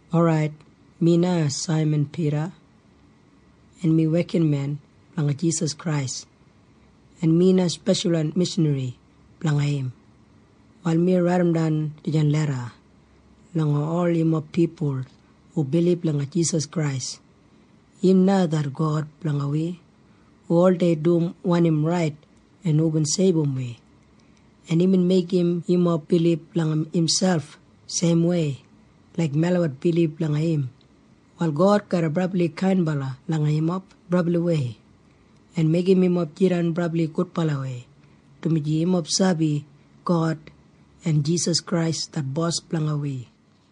Orait, mi na Saiman Pida, en mi wekinmen blanga Jisas Krais, en mi na speshalwan mishanri blanga im. Wal mi raidimdan dijan leda langa ol yumob pipul hu bilib langa Jisas Krais. Im na det God blanga wi hu oldei dum wanim rait en hubin seibum wi, en imbin meigim yumob bilib langa imselp seimwei laik melabat bilib langa im. Wal God garra brabli kainbala langa yumob brabliwei en meigim yumob jidan brabli gudbalawei, dumaji yumob sabi God en Jisas Krais det Bos blanga wi.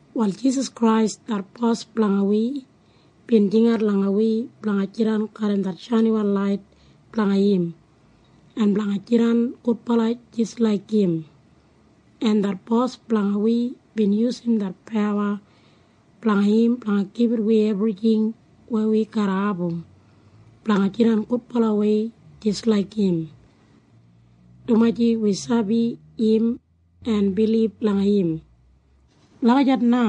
Wal Jisas Krais det Bos blanga wi bin jingat langa wi blanga jidan garram det shainiwan lait blanga im en blanga jidan gudbala jis laik im, en det Bos blanga wi bin yusum det pawa blanga im blanga gibit wi ebrijing weya wi garra abum blanga jidan gudbalawei jis laik im, dumaji wi sabi im en bilib langa im. Lagijat na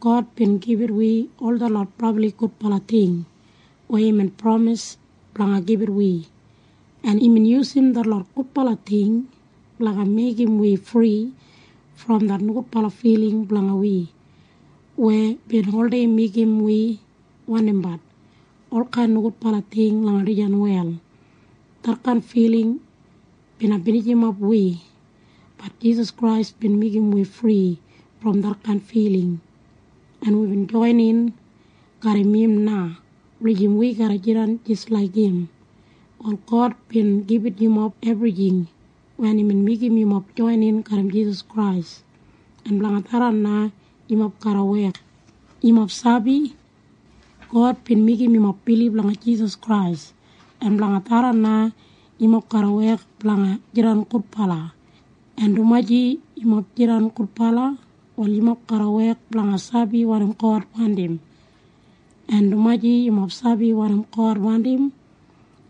God bin gibit wi ol detlot brabli gudbala ting weya imbin pramis blanga gibit wi. En imbin yusum detlot gudbala ting blanga meigim wi fri brom wi nogudbala filing weya wibin oldei wandimbat olkain nogudbala ting langa dijan wel. Detkain filing na garra binijimap wi. Bat Jisas Krais bin meigim wi fri brom detkain filing, en wibin joinin garram im na wulijim wi garra jidan jis laik im. Wal God bin gibit yumob ebrijing wen imbin meigim yumob joinin garram Jisas Krais, en blanga tharran na yumob garra wek. Yumob sabi? God bin meigim yumob bilib langa Jisas Krais, en blanga tharran na yumob garra wek blanga jidan gudbala. En dumaji yumob jidan gudbala, wal yumob garra wek blanga sabi wanim God wandim. En dumaji yumob sabi wanim God wandim,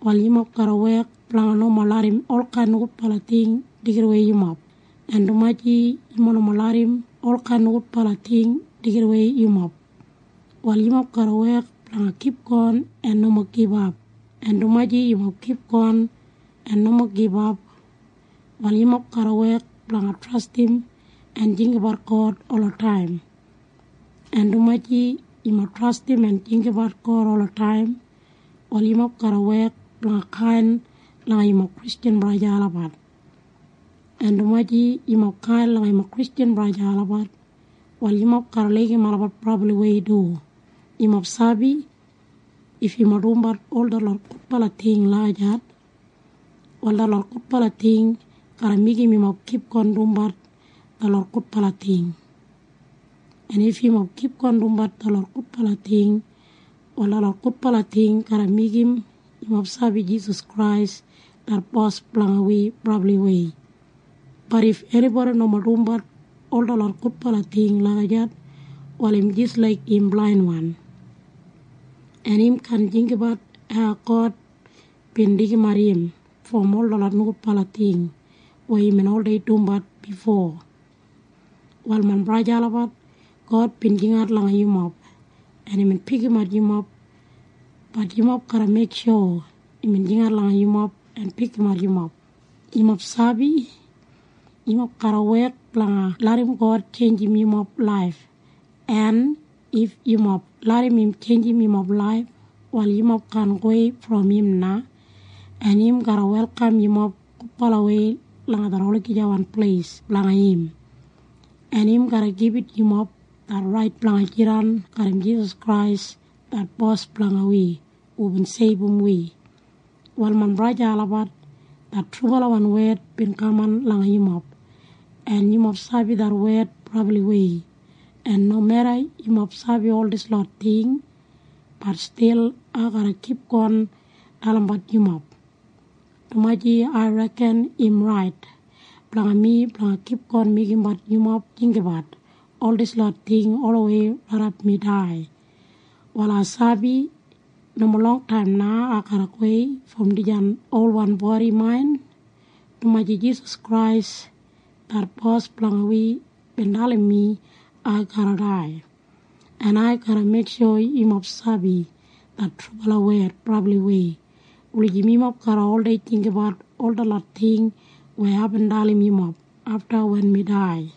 wal yumob garra wek blanga nomo larram olkain nogudbala ting deigidawei yumob. En dumaji yumob nomo larram olkain nogudbala ting deigidawei yumob, wal yumob garra wek blanga kipgon en nomo gibap. En dumaji yumob kipgon en nomo gibap, wal yumob garra wek blanga trastim en jinggabat God olataim. En dumaji yumob trastim en jinggabat God olataim, wal yumob garra wek blanga kain langa yumob Kristjan braja en sista olabat. En dumaji yumob kain langa yumob Kristjan braja en sista olabat, wal yumob garra laigim olabat brabliwei du. Yumob sabi? If yumob dumbat ol detlot gudbala ting lagijat, wal detlot gudbala ting garra meigim yumob kipgon dumbat detlot gudbala ting. En if yumob kipgon dumbat detlot gudbala ting, wal detlot gudbala ting garra meigim yumob sabi Jisas Krais det Bos blanga wi brabliwei. Bat if enibodi nomo dumbat ol detlot gudbala ting lagijat, wal im jis laik im jidan blainwan, en im kaan jinggabat hau God bin deigimat im brom ol detlot nogudbala ting weya imbin oldei dumbat bifo. Wal main braja en sista olabat, God bin jingat langa yumob, en imbin pikimat yumob. Bat yumob garra meiksho imbin jingat langa yumob en pikimat yumob. Yumob sabi? Yumob garra oldei larram God kipgon tjeinjimbat yumob laif, en if yumob larram im tjeinjim yumob laif, wal yumob kaan gowei brom im na, en im garra welkam yumob gudbalawei langa det olagijawan pleis blanga im, en im garra gibit yumob det rait blanga jidan garram Jisas Krais det Bos blanga wi hubin seibum wi. Wal main braja en sista olabat, det trubalawan wed bin kaman langa yumob, en yumob sabi det wed brabliwei. En nomeda yumob sabi ol dislot ting, bat stil ai garra kipgon dalimbat yumob, dumaji ai reken im rait blanga mi blanga kipgon meigimbat yumob jinggabat ol dislot ting olawei raidap mi dai. Wal ai sabi nomo longtaim na ai garra gowei brom dijan olwan bodi main, dumaji Jisas Krais det Bos blanga wi bin dalim mi ai garra dai. En ai garra meiksho yumob sabi det trubala wed brabliwei wulijim yumob garra oldei jinggabat ol detlot ting weya aibin dalim yumob afta wen mi dai.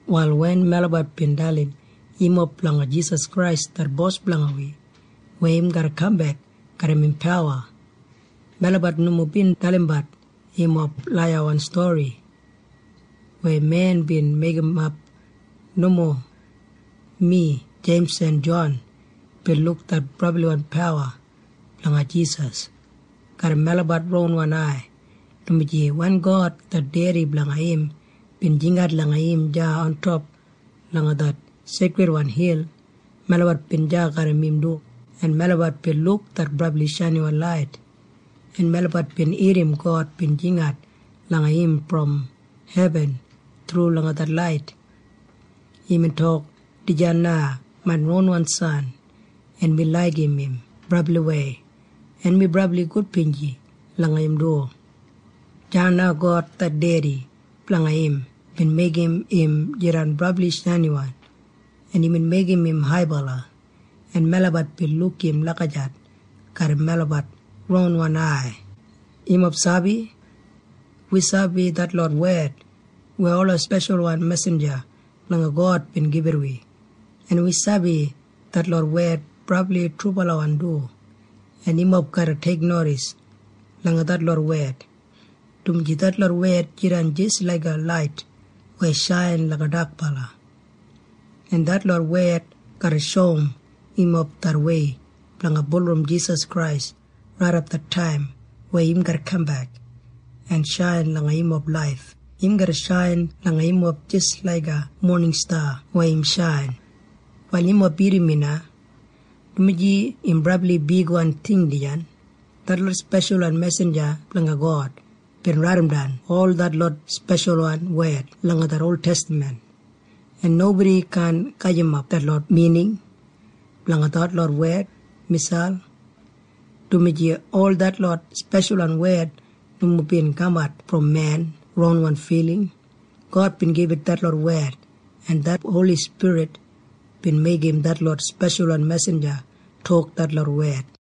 Wal wen melabat bin dalim yumob blanga Jisas Krais det Bos blanga wi weya im garra kambek garram im pawa, melabat nomo bin dalimbat yumob laiyawan stori weya men bin meigimap. Nomo. Mi en Jeims en Jon bin luk det brabliwan pawa blanga Jisas garram melabat ronwan ai, dumaji wen God det Dedi blanga im bin jingat langa im deya ontop langa det seikridwan hil, melabat bin deya garram im du, en melabat bin luk det brabli shainiwan lait, en melabat bin irrim God bin jingat langa im brom hebin thru langa det lait. Imbin tok, “Dijan na main ronwan san, en mi laigim im brabliwei, en mi brabli gudbinji langa im du.” Deya na God det Dedi blanga im bin meigim im jidan brabli shainiwan, en imbin meigim im haibala, en trubala melabat bin luk im lagijat garram melabat ronwan ai. Yumob sabi? Wi sabi detlot wed weya ola speshalwan mesinja blanga God bin gibit wi, en wi sabi detlot wed brabli trubalawan du, en yumob garra teiknodis langa detlot wed, dumaji detlot wed jidan jis laiga lait weya shain langa dakbala, en detlot wed garra shoum yumob det wei blanga bulurrum Jisas Krais raidap det taim weya im garra kambek en shain langa yumob laif. Im garra shain langa yumob jis laiga moningsta weya im shain. Wal yumob irrim mi na, dumaji im brabli bigwan ting dijan. Detlot speshalwan mesinja blanga God bin raidimdan ol detlot speshalwan wed langa det oltestaman, en nobodi kaan gajimap detlot mining blanga detlot wed miselp, dumaji ol detlot speshalwan wed nomo bin kamat brom men ronwan filing. God bin gibit detlot wed, en det Holi Spirit bin meigim detlot speshalwan mesinja tok detlot wed.